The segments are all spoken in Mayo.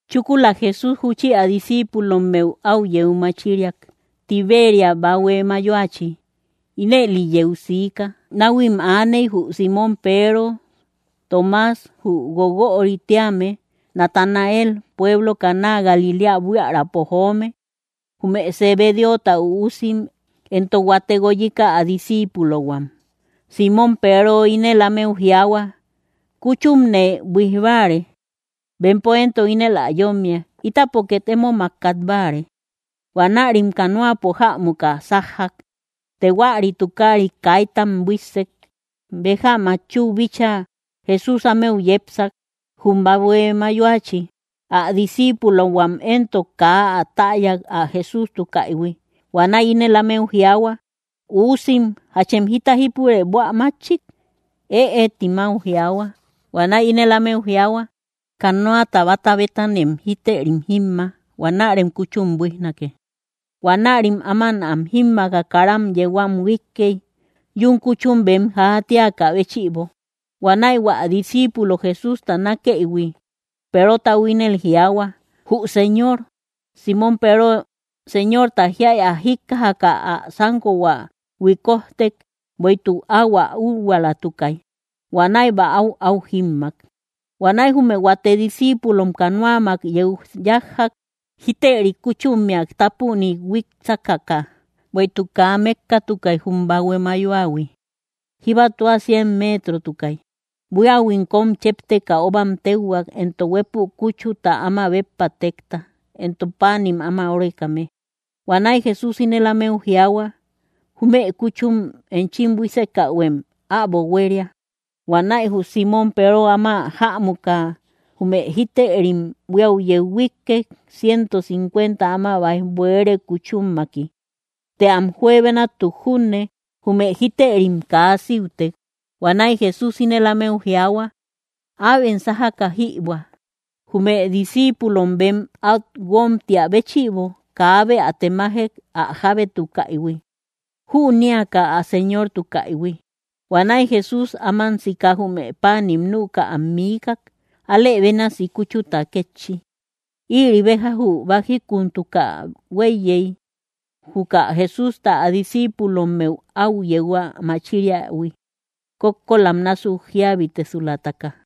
Chúkula Jesús júchi ä discíipulommeu áu yeu machiriak, Tiberia bahue mayoachi. Ínëli yeu siika: Náhuim aaney, jü Símon Peero, Toomas jü Guoguörï tíame, Natanael pueblo Caná Galiléa buiärapo joome, jume Zebedeota üusim, éntok huate guoyika ä disciipulohuam. Símon Peero ínel ámeu jiaahua: —Kúchumne buíj báare. Bempo éntok ínel ä yómmiak: —Ítapo két émomak kat báare. Huanärim canoapo jämuka sájjak. Të huäri tukaarit kaitam buíssek. Béja matchuu bíchaa, Jesús ámeu yepsak, jum bahue mayoachi. Ä disciipulohuam éntok kaa ä täyay, ä Jesústukaïhui. Huanäi ínel ámeu jiaahua: —Uusim, ¿jachem jita jípure buä mátchik? —Ëe —tim áu jiaahua. Huanäi ínel ámeu jiaahua: —Canoata báta bétanem jítërim jímma; huanärem kúchum buíjnake. Huanärim áman am jímmaaka, kara yeu am huíkkey, yún kúchum bem játiakä béchïbo. Huanäi hua disciipulo Jesústa nákeïhui, Perotau ínel jiaahua: —¡Jü Señor! Símon Peero, Señorta jíay ä jíkkajaka, ä sánkohua huikojtek, bueïtuk áu ä úhuaalatukay. Huanäi bäau áu jímmak. Huanäi jume huate discíipulom canoamak yeu yájjak, jítërim kúchummea tápunik huík sákaka; bueïtuk kaa mékkatukay jum bahue mayoahui, jíba tua cien meetrotukay. Buíahuim kóm chépteka óbam téuhuak, éntok huépü kúchuta áma béppa tekta, éntok páanim áma órekame. Huanäi Jesús ínel ámeu jiaahua: —Jume kúchum enchim buísekähuem äbo huéria. Huanäi jü Símon Peero áma jämuka jume jítërim buíau yeu huíkkek, ciento cincuenta áma báij buere kúchummaki; të am juebenamtuk junne, jume jítërim kaa síutek. Huanäi Jesús ínel ámeu jiaahua: —Äbem sájaka jïbuä. Jume discíipulom bem át guómtia béchïbo, kaabe ä temajek ä jábétukaïhui, jünéaka ä Señortukaïhui. Huanäi Jesús áman sika jume páanim nüka am miikak. Alë bénasi kúchuta kétchi. Ïri béja jü bájikuntuka huéiyey, juka Jesústa ä discíipulommeu áu yeu ä machiriähui, kókkolam násuk jíabitesulataka.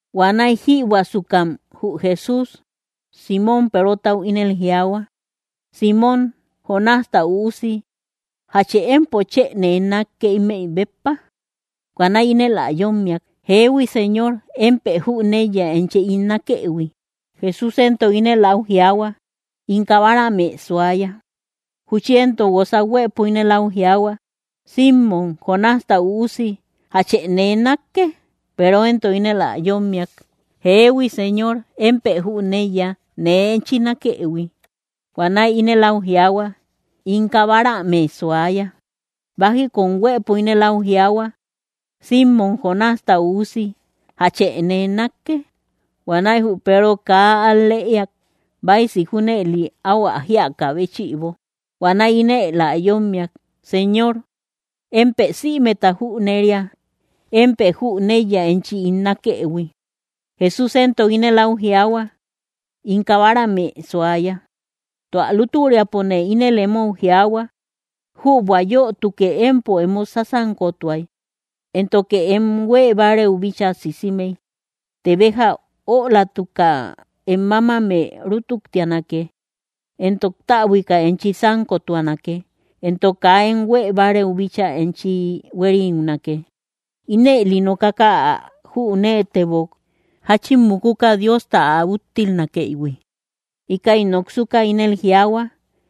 Huanäi jïbuäsukam jü Jesús Símon Perotau ínel jiaahua: —Símon, Jonásta üusi, ¿jache empo chë nee nákke, ímëi béppa? Huanäi ínel ä yómmiak: —Jeehui, Señor; émpë jüneiya enchi ín nákëhui. Jesús éntok ínel áu jiaahua: —In kabaramë suaya. Júchi éntok guosa huëpo ínel áu jiaahua: —Símon, Jonásta üusi, ¿jache nee nákke? Peero éntok ínel ä yómmiak: —Jeehui, Señor, empo jüneiya nee enchi nákëhui. Huanäi ínel áu jiaahua: —In kabaramë suaya. Bájikun huëpo ínel áu jiaahua: —Símon, Jonásta üusi, ¿jache nee nákke? Huanäi jü Peero kaa al‑lëiak, báisi junëli áu ä jíakä béchïbo. Huanäi ínel ä yómmiak: —Señor, émpë sïmeta jüneria; émpë jüneiya enchi ín nákëhui. Jesús éntok ínel áu jiaahua: —In kabaramë suaya. Tua lútüriapone ínel emou jiaahua: Jübua yötuke empo emo sásankotuay, éntoke em huée bárëu bíchaa sisimey; të béja ölatuka, em mámamë rutuktianake, éntok täbuika enchi sánkotuanake, éntok kaa em huée bárëu bíchaa enchi huériunake. Ínëli nokaka ä jüneetebok, jáchin mukuka Diosta ä úttilnakëïhui. Íkäi noksuka ínel jiaahua: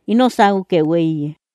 —¡Ino sáukë huéiye!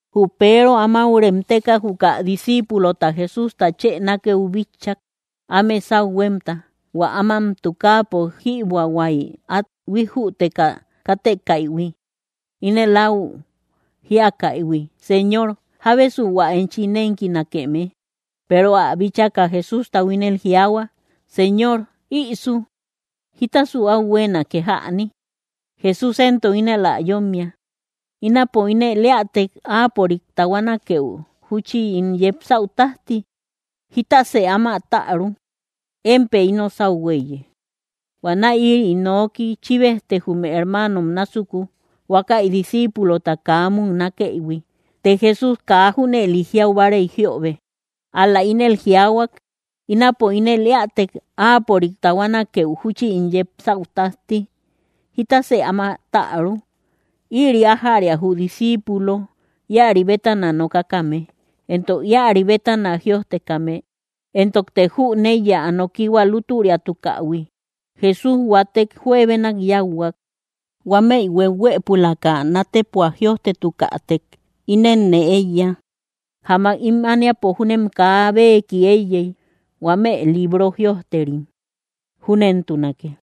Jü Peero, amáu remteka, juka disciipulota Jesústa chë nákëu bitchak, áme sáu huémta, hua áman tukaapo jïbuähuay át huijjüteka kátekäihui, ínel áu jíakäihui: “Señor, ¿jábesu hua enchi nénkinakeme?” Peero ä bíchaka Jesústau ínel jiaahua: —Señor, ¿ïsu? ¿Jítasu áu huéenake jäni? Jesús éntok ínel ä yómmiak: —Ínapo ínel éätek, áapörik tahuanakeu júchi ín yepsäu tájti, ¿jitasë áma täru? Émpë ino sáu huéiye. Huanäi ïri noki chíbejtek jume hermaanom násuku, huákäi disciipulota kaa muknakëïhui. Të Jesús kaa junëli jiau báarey jiöbe, ál‑la ínel jiaahuak: “Ínapo ínel éätek áapörik tahuanakeu júchi ín yepsäu tájti, ¿jítasë áma täru?” Ïri ájäria jü disciipulo íäri bétana nokakame, éntok íäri bétana jïojtekame; éntokte jüneiya, ä nokihua lútüriatukähui. Jesús huatek juebenak yáuhuak. Huámëi hueuhuëpulaka nátepua jïojtetukätek, ínenne éiya, jamak ím ániapo júnem kaa beeki éiyey, huame librom jïojterim. Júnentunake.